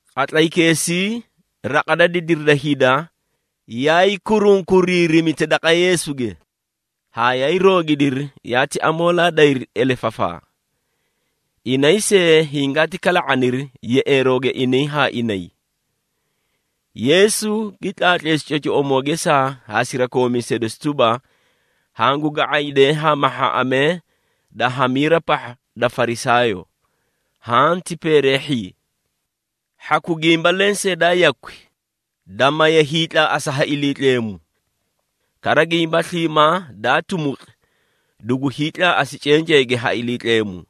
Qatlaykeesii, raqa da didiri da hida yaay kurunkuriirimita daqa Yeesuge, haa yaay roogidiri yaati amoolaa dayri elefafaa. Inay see hingaati kala⁄aniri yeꞌeerooge inay haa inay. Yeesu gi tlaatleesi cocoꞌomoo gesaa haa sirakoomiisee dosi tuba, “Hangu ga⁄aydee haa mahhaaꞌamee da hamiira pahha da Farisaayoo, haã ti peereehhii. Hhaku gimba lensee daa yakwi, da maye hiitlaaꞌasa ha Iliitleemu. Kara gimba sliimaa daa tumuqi, dugu hiitlaaꞌasi cenceege ha Iliitleemu.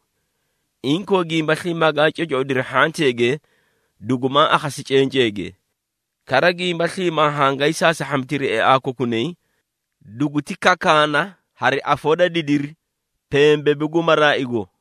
Inkoo, gimba sliimaa gaa cocoꞌodiri hhanteege, dugumaa akhasi cenceege. Kara gimba sliimaa hangaay saasahhamitiri eaa kokunay, duguti kakaana hari afoo da didiri pembebu gu maraaigo.”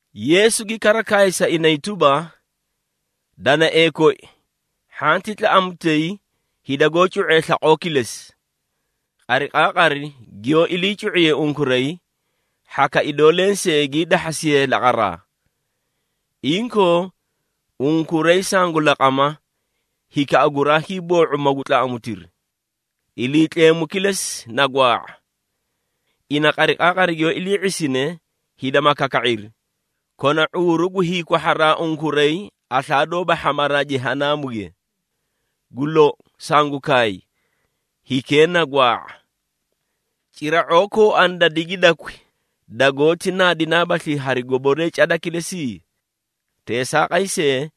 Yeesu gi kara kaay sa inay tuba, “Danaee koi, hhanti tlaꞌamutay hida goó cu⁄ee slaqoo kilesi. Qariqaaqari giyoó ilii cu⁄iyee unkuray, hhaka idoo lensee gii dahhasiyee laqaraa! Inkoo, unkuray sangu laqama, hikaꞌa guraa hiiboo⁄u magu tlaꞌamutiri. Iliitleemu kilesi na gwaa⁄a! Ina qariqaaqari giyoó ilii ⁄isine hida ma kaka⁄iri, kona ⁄uuru gu hiikwahharaa unkuray aslaa doóba hhamaraa Jehanaamuge! Gu lou, sangu kaay, hikee na gwaa⁄a! Cira⁄oo kooani da digidakwi, dagoóti naadinaabaslii hari goboree cada kilesi? Teesaaqay see,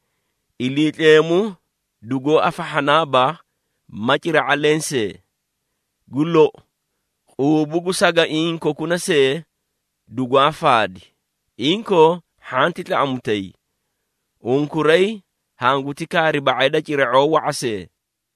Iliitleemu dugoó afahhanaaba, ma cira⁄a lensee! Gu lou, quubu gu sagaiĩ kokuna see dugwaa faadi. Inkoo, hhanti tlaꞌamutay! Unkuray hanguti kaari ba⁄ay da cira⁄oo wa⁄a see!”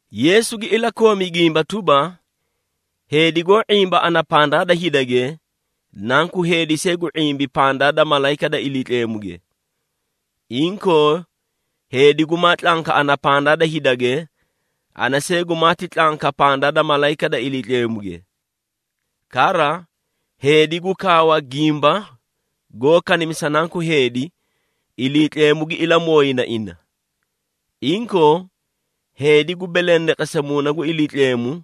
Yeesu gi ilakoomi gimba tuba, “Heedi goó ⁄imba ana pandaa da hidage, Nanku Heedi see gu ⁄imbi pandaa da malayika da Iliitleemuge. Inkoo, heedi gumaa tlanka ana pandaa da hidage, ana see gumaati tlanka pandaa da malayika da Iliitleemuge. Kara, heedi gu kaawa gimba goó kanimisa Nanku Heedi, Iliitleemu gi ilamooyina ina. Inkoo, heedi gu belendeqesa Muuna gu Iliitleemu,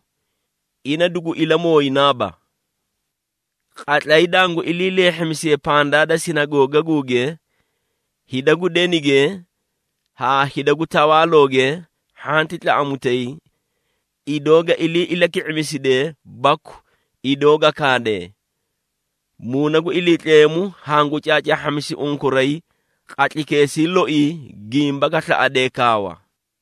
ina dugu ilamooyinaaba. Qatlay dangu ilii leehhimisiye pandaa da sinagoogaguuge, hida gu denige haa hida gu tawaalooge, hhanti tlaꞌamutay, idoo ga ilii ilaki⁄imisidee baku idoo ga kaadee. Muuna gu Iliitleemu hangu caacaahhamisi unkuray qatlaykeesii loii gimba ga slaꞌade kaawa.”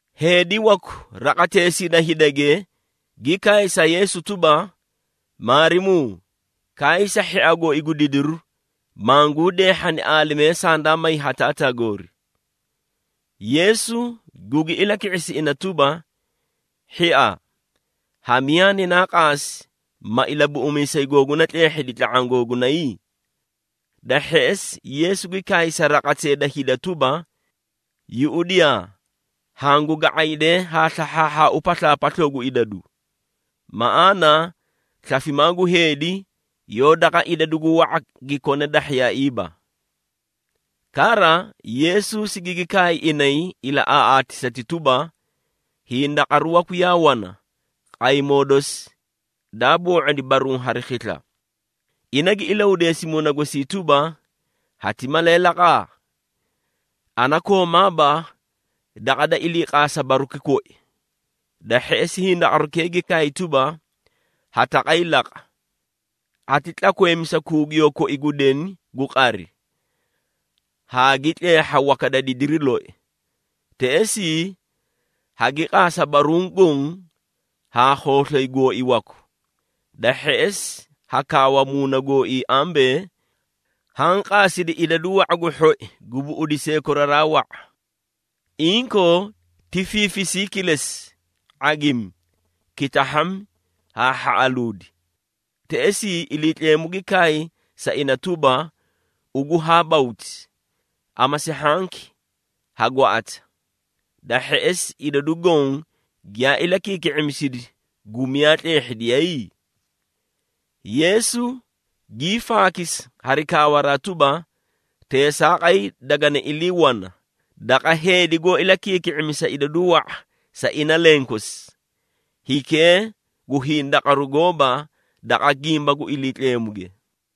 Heedi waku raqateesii da hidage, gi kaay sa Yeesu tuba, “Maarimuu, kaay sa hhia gooi gu didiru, manguu deehhani aalimee sandaa may ha taataa goori.” Yeesu gugi ilaki⁄isi ina tuba, “Hhia, ha miyaa ninaa qaasi, ma ilabuꞌumiisay googuna tleehhidi tla⁄aã googunay?” Da hheꞌesi, Yeesu gi kaay sa raqatee da hida tuba, “Yuꞌudiyaa! Hangu ga⁄aydeei haa slahhaahhaau paslaapasloo gu idadu. Maꞌaana slafimaa gu heedi, yoó daqa idadu gu wa⁄a gi kone dahhiyaaiiba.” Kara, Yeesu sigigi kaay inay ilaꞌaaꞌaatisati tuba, “Hindaqaru waku yaa wana, qaymoo dosi, daa boo⁄odi baruũ hari khisla. Ina gi ilahudeesi muuna gosii tuba, ‘Hati malee laqaa? Ana koomaaba daqa da iliiqaasa baruki koyi!’ Da hheꞌesi hindaqarukee gi kaay tuba, ‘Ha taqay laqa! Hati tlakweemisa kuugiyoo koi gu deni gu qari, haa gi tleehha waka da didiri loi! Teꞌesii hagi qaasa baruũ goõ haa khooslay gooi waku.’ Da hheꞌesi ha kaawa muuna gooii ambee, ‘Haã qaasidi idadu wa⁄a gu hhoi gu buꞌudisee koraraa wa⁄a! Inkoo, ti fiifisii kilesi, ⁄agimi, kitahhami haa hhaꞌaluudi!’ Teꞌesii, Iliitleemu gi kaay sa ina tuba, ‘Ugu haa bawti! Amasi hhanki, ha gwaꞌata! Da hheꞌesi, idadu goõ giyaa ilakiiki⁄imisidi gu miyaa tleehhidiyay?’” Yeesu gii faakisi hari kaawaraa tuba, “Teesaaqay dagani ilii wana, daqa heedi goó ilakiiki⁄imisa idadu wa⁄a sa ina lenkosi, hikee gu hindaqaru gooba daqa gimba gu Iliitleemuge.”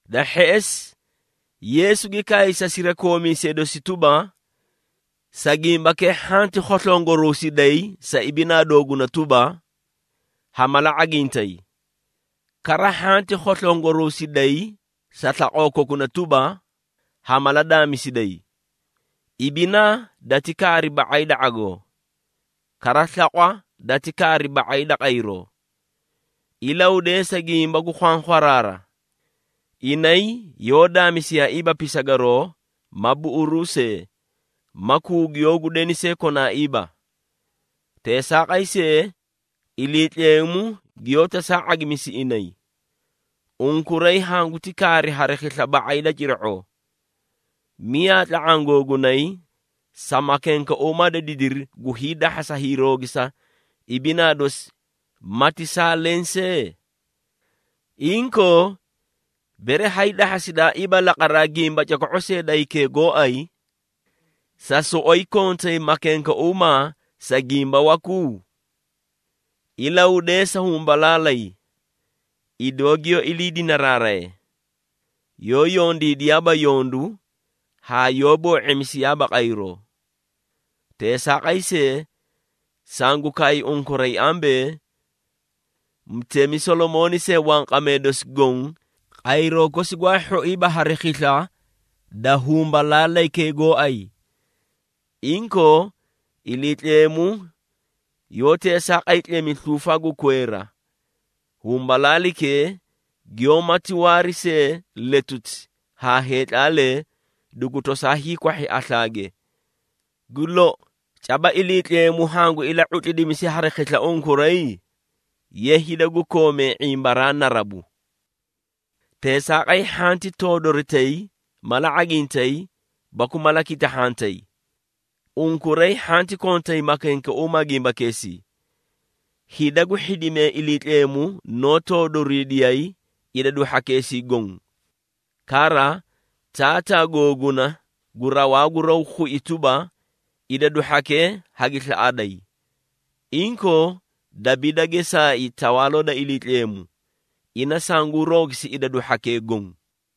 Da hheꞌesi, Yeesu gi kaay sa sirakoomiisee dosi tuba, “Sa gimbakee hhanti khoslongoruusiday sa ibinaa dooguna tuba, ha mala ⁄agintay. Kara hhanti khoslongoruusiday sa slaqoo kokuna tuba, ha mala daamisiday. Ibinaa dati kaari ba⁄ay da ⁄agoo. Kara slaqwa dati kaari ba⁄ay da qayroo! Ilahudeesa gimba gu khwankhwaraara. Inay yoó daamisiyaaiiba pisagaroo ma buꞌuruu see, ma kuugiyoo gu deni see konaaiiba. Teesaaqay see, Iliitleemu giyoó tosaa ⁄agimisi inay. Unkuray hanguti kaari hari khisla ba⁄ay da cira⁄oo! Miyaa tla⁄aã googunay sa makenkeuumaa da didiri gu hiidahhasa hiiroogisa ibinaa dosi mati saa leẽ see? Inkoo, bere hay dahhasidaaiiba laqaraa gimba coko⁄u see da hikee gooay, sa soꞌoyi kontay makenkeuumaa sa gimba waku? Ilahudeesa humbalaalay, idoo giyoó ilii dinaraaraye. Yoó yondiidiyaaba yondu haa yoó boo⁄imisiyaaba qayroo. Teesaaqay see, sangu kaay unkuray ambee, mutemi Solomooni see wanqamee dosi goõ, qayroo kosi gwaa hhoiiba hari khisla da humbalaalaykee gooay! Inkoo, Iliitleemu yoó teesaaqay tlemi sluufa gu kweera, humbalaalaykee giyoómati waari see letuti haa heetlaalee dugu tosaa hiikwahhi aslaage. Gu lou, caba Iliitleemu hangu ila⁄utlidimisi hari khisla unkuray? Ye hida gu koomee ⁄imbaraa narabu! Teesaaqay, hhanti toodoritay, mala ⁄agintay baku mala kitahhantay. Unkuray hhanti kontay makenkeuumaa gimbakeesii. Hida gu hhidimee Iliitleemu noó toodoriidiyay idadu hhakeesii goõ. Kara, Taataa googuna gu rawaa gu raw khui tuba, idadu hhakee hagi slaꞌaday! Inkoo, dabiida geesaai Tawaaloo da Iliitleemu, ina sanguu roogisi idadu hhakee goõ.”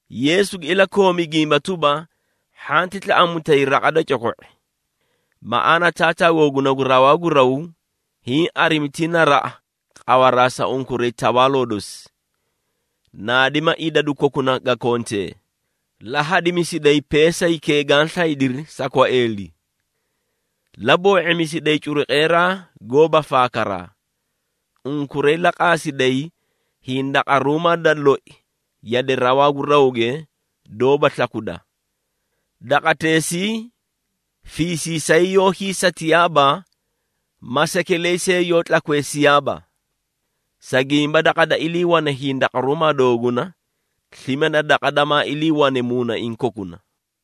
Yeesu gi ilakoomi gimba tuba, “Hhanti tlaꞌamutay, raqa da coko⁄i! Maꞌaana Taataa googuna gu rawaa gu raw, hiĩ arimi ti naraꞌa, qawaraa sa unkuray Tawaaloo dosi. Naadima idadu kokuna ga kontee, la hadimisiday peesaykee gaã slaydiri sa kwaeeli. La boo⁄imisiday curuqeeraa goóba faakaraa. Unkuray la qaasiday hindaqaruumaa da loi yade rawaa gu rawge doóba slakuda. Daqateesii fiisiisay yoó hiisatiyaaba ma sekeley see yoó tlakweesiyaaba. Sa gimba daqa da iliiwane hindaqaruumaa dooguna, slime na daqa damaa iliiwane muunaiĩ kokuna.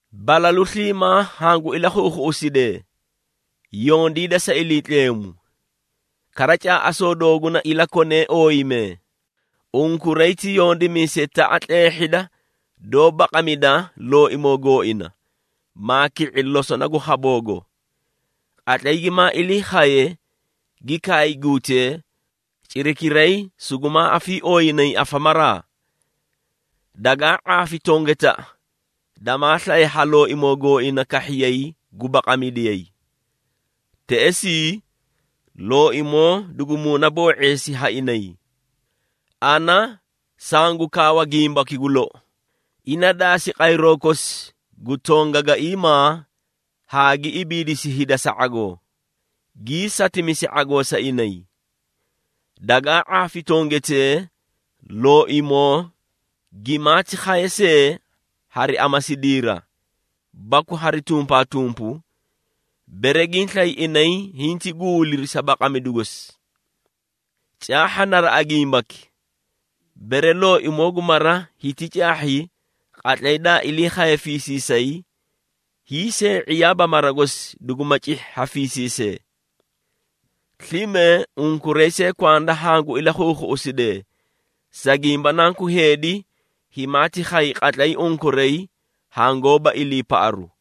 Balalu sliimaa hangu ilakhuukhuꞌusidee, yondiida sa Iliitleemu. Kara caaꞌasoo dooguna ilakonee ooyimee. Unkuray ti yondimiisetaꞌa tleehhida doó baqamida looimoo gooina, maa ki⁄i losona gu khaboogo. Qatlay gimaa ilii khaye, gi kaay guutee, cirakiray sugumaa afiiooyinayi afamaraa. Dagaa ⁄aafi tongetaꞌa damaa slaye haa looimoo gooina kahhiyay gu baqamidiyayi. Teꞌesii looimoo dugu muunaboo⁄eesi ha inay. Ana sangu kaawa gimbaki gu lou, ina daasi qayroo kosi gu tongaiimaa haa gi ibiidisi hida sa ⁄agoo, gii satimisi ⁄agoo sa inay! Dagaa ⁄aafi tongetee, looimoo gimaati khaye see hari amasidiira, baku hari tumpaatumpu, bere giĩ slay inay hinti guuliri sa baqamidu gosi! Caahha naraꞌa gimbaki. Bere looimoo gu mara hiti caahhi qatlay daa ilii khaye fiisiisay, hiisee⁄iyaaba mara gosi duguma cihhi ha fiisiisee. Slime unkuray see kwanda hangu ilakhuukhuꞌusidee, sa gimba Nanku Heedi, himaati khay qatlay unkuray hangoóba iliipaꞌaru.”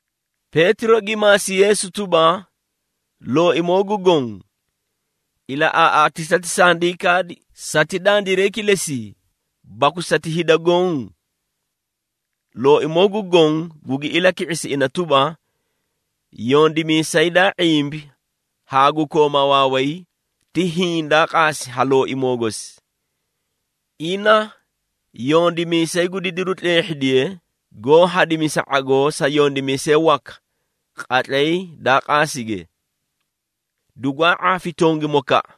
Peetiro gi maasi Yeesu tuba, “Looimoo gu Goõ ilaꞌaaꞌaatisati sandii kaadi, sati dandiray kilesii, baku sati hida goõ?” Looimoo gu Goõ gugi ilaki⁄isi ina tuba, “Yondimiisay daa ⁄imbi haa gu kooma waaway, ti hiĩ daa qaasi ha looimoo gosi. Ina, yondimiisay gu didiru tleehhidiye, goó hadimisa ⁄agoo sa yondimiisee waka qatlay daa qaasige. Dugwaa ⁄aafi tongimokaꞌa,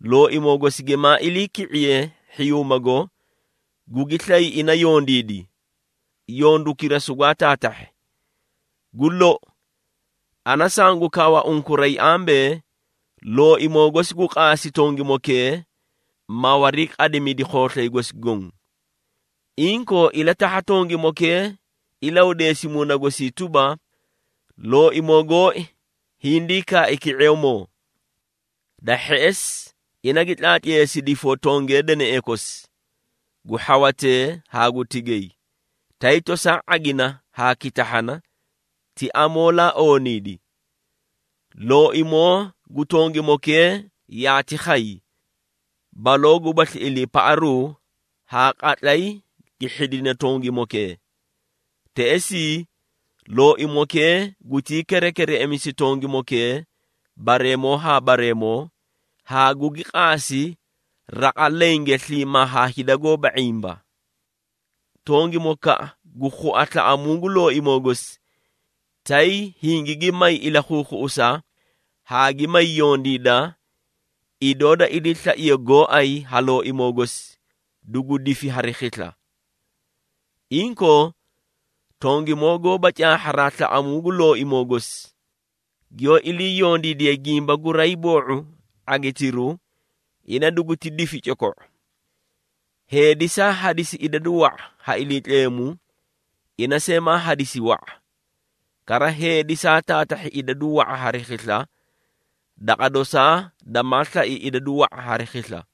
looimoo gosi gimaa iliiki⁄iye hhiyuumago, gugi slay ina yondiidi, yondukira sugwaa taatahhi. Gu lou, ana sangu kaawa unkuray ambee, looimoo gosi gu qaasi tongimokee, ma wariiqadimidi khooslay gosi goõ. Inkoo, ilatahha tongimokee ilahudeesi muuna gosii tuba, ‘Looimoo gooi hindii kaai ki⁄eemoo.’ Da hheꞌesi, ina gi tlaatleesi difoo tongee deneꞌee kosi, gu hhawatee haa gu tigay, tay tosaa ⁄agina haa gi kitahhana, ti amoolaa ooniidi. Looimoo gu tongimokee yaati khay, baloo gubasli iliipaꞌaru haa qatlay gi hhidine tongimokee. Teꞌesii, looimokee gutii kerekereꞌemisi tongimokee bareemoo haa bareemoo, haa gugi qaasi raqa lenge sliimaa haa hida goóba ⁄imba. Tongimokaꞌa goó khua slaꞌamuu gu looimoo gosi, tay hingigi may ilakhuukhuꞌusa, haa gi may yondiida, idoo da iliislaiye gooay ha looimoo gosi, dugu difi hari khisla. Inkoo, tongimoo goóba caahharaa slaꞌamuu gu looimoo gosi, giyoó ilii yondiidiye gimba guraay boo⁄u ⁄agitiru, ina duguti difi coko⁄u. Heedi saa hadisi idadu wa⁄a ha Iliitleemu, ina see maa hadisi wa⁄a. Kara heedi saa taatahhi idadu wa⁄a hari khisla, daqa dosaa damaa slai idadu wa⁄a hari khisla.”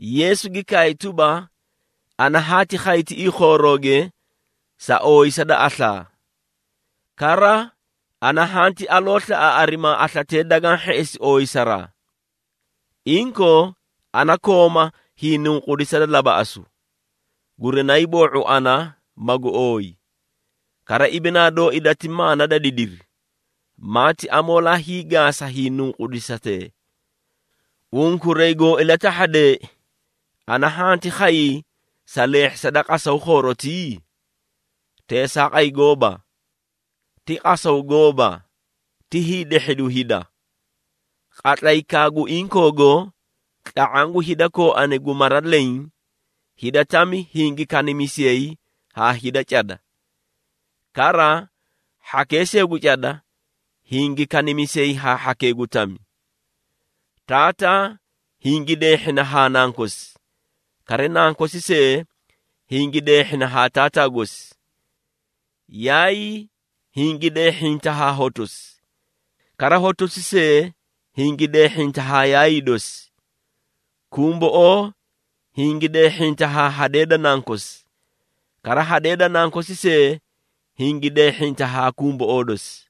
Yeesu gi kaay tuba, “Ana haati khay tiꞌii khoorooge sa ooyisa da aslaa. Kara, ana hanti aloo slaꞌa arimaa, aslatee dagaã hheꞌesi ooyisaraa! Inkoo, ana kooma hiinunqudisa da labaꞌasu, gurinaay boo⁄u ana magu ooyi. Kara ibinaa dooi dati maana da didiri, maati amoolaa hiigaasa hiinunqudisatee! Unkuray goo ilatahhadeei, ana hanti khayii sa leehhisa da qasaw khoorotii? Teesaaqay gooba! Ti qasaw gooba, ti hiidehhidu hida. Qatlaykaa gu inkoogo, tla⁄aã gu hida kooani gu mara leẽ, hida tami hingi kanimisiyay haa hida cada. Kara hhakee see gu cada hingi kanimisiyay haa hhakee gu tami. Taataa hingi deehhina haa nankosi, kara nankosi see hingi deehhina haa taataa gosi. Yaayii hingi deehhinta haa hotosi, kara hotosi see hingi deehhinta haa yaayii dosi. Kumboꞌoo hingi deehhinta haa hadee da nankosi, kara hadee da nankosi see hingi deehhinta haa kumboꞌoo dosi.”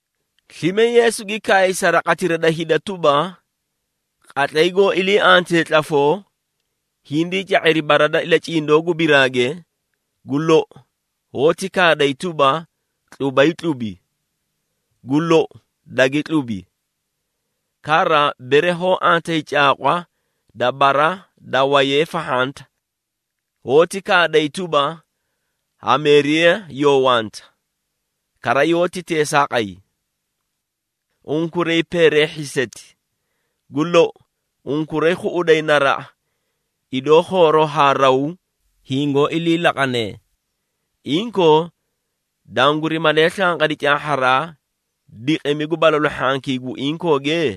Slime Yeesu gi kaay sa raqatira da hida tuba, “Qatlay goó ilii antee tlafoo, hindii ca⁄iri bara da ilacindoo gu biraage, gu lou hoóti kaaday tuba, ‘Tlubay tlubi,’ gu lou dagi tlubi. Kara, bere hoó antayi caaqwa da bara da wayee fahhanta, hoóti kaaday tuba, ‘Hameeriya yoo wanta,’ kara yoóti teesaaqay. Unkuray peereehhiiseti! Gu lou, unkuray khuꞌuday naraꞌa, idoo khooroo haa raw hingoó ilii laqanee. Inkoo, danguri malee slanqadi caahharaa diqimi gu balalu hhankii gu inkooge?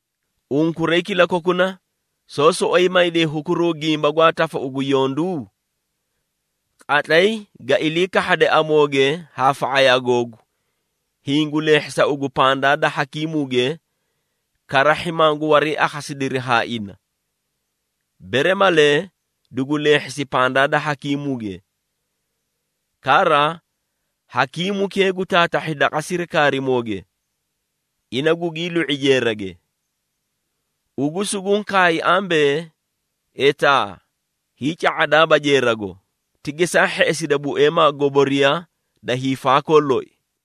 Unkuray kilakokuna soó soꞌoyi mayday hukuruu gimba gwaa tafau gu yondu? Qatlay ga ilii kahhade amooge haa fa⁄ayaa googu, hiĩ gu leehhisa ugu pandaa da hakiimuuge, karahhi mangu wariiakhasidiri haa ina. Bere malee, dugu leehhisi pandaa da hakiimuuge. Kara, hakiimukee gu taatahhi daqa sirikaarimooge, ina gugii lu⁄i jeerage. Ugu sunguũ kaay ambee, etaa hiica⁄adaaba jeerago, ti geesaa hheꞌesida bueemaa goboriya da hiifaakoo loi!”